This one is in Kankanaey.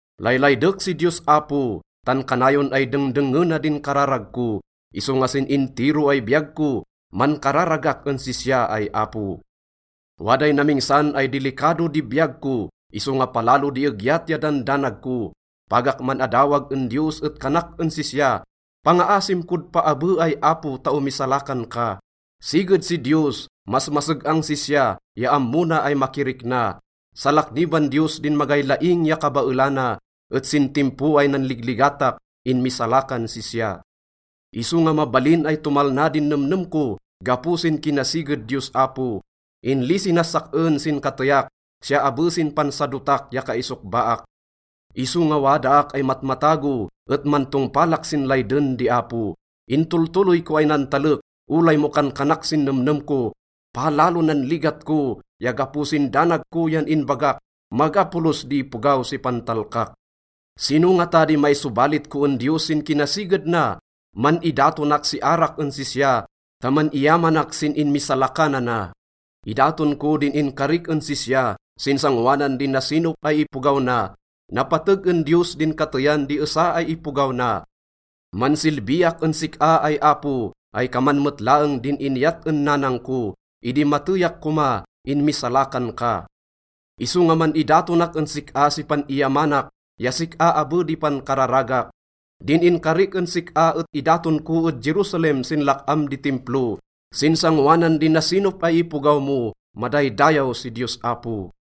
Laylaydek si Diyos Apo, tan kanayon ay dengdengngena din kararag ko. Isonga sin intiro ay biyag ko, mankararagak en sisya ay Apo. Waday namingsan ay dilikado di biyag ko, isonga palalo di egyat ya dandanag ko. Pagak man-adawag en Diyos et kanak en sisya, “Pangaasim kod paabe ay Apo ta omisalakan ka.” Siged si Diyos, masmaseg-ang sisya ya ammo na ay makirikna. Salakniban Diyos din magay laing ya kabaelana, et sin timpo ay nanligligatak, inmisalakan sisya. Isonga mabalin ay tomalna din nemnem ko gapo sin kinasiged Diyos Apo. Inlisi nas sak-en sin kateyak, siya abe sin pansadotak ya kaisokbaak. Isonga wadaak ay matmatago, et mantongpalak sin layden di Apo. Intoltoloy ko ay nantalek olay mo kankanak sin nemnem ko, “Palalo nan ligat ko,” ya gapo sin danag ko yan inbagak, “Maga polos di ipogaw si pantalkak.” Sino ngata di maisobalit ko en Diyos sin kinasiged na? Man-idatonak si arak en sisya ta man-iyamanak sin inmisalakanana. Idaton ko din inkarik en sisya sin sangoanan di nasinop ay ipogaw na. Napateg en Diyos din kateyan di esa ay ipogaw na. Mansilbiak en sik-a ay Apo ay kaman met laeng din inyat en nanang ko. Idi mateyak koma, inmisalakan ka, isonga man-idatonak en sik-a si pan-iyamanak ya sik-a abe di pankararagak. Din inkarik en sik-a et idaton ko ed Jerusalem sin lak-am di Timplo sin sangoanan di nasinop ay ipogaw mo. Madaydayaw si Diyos Apo!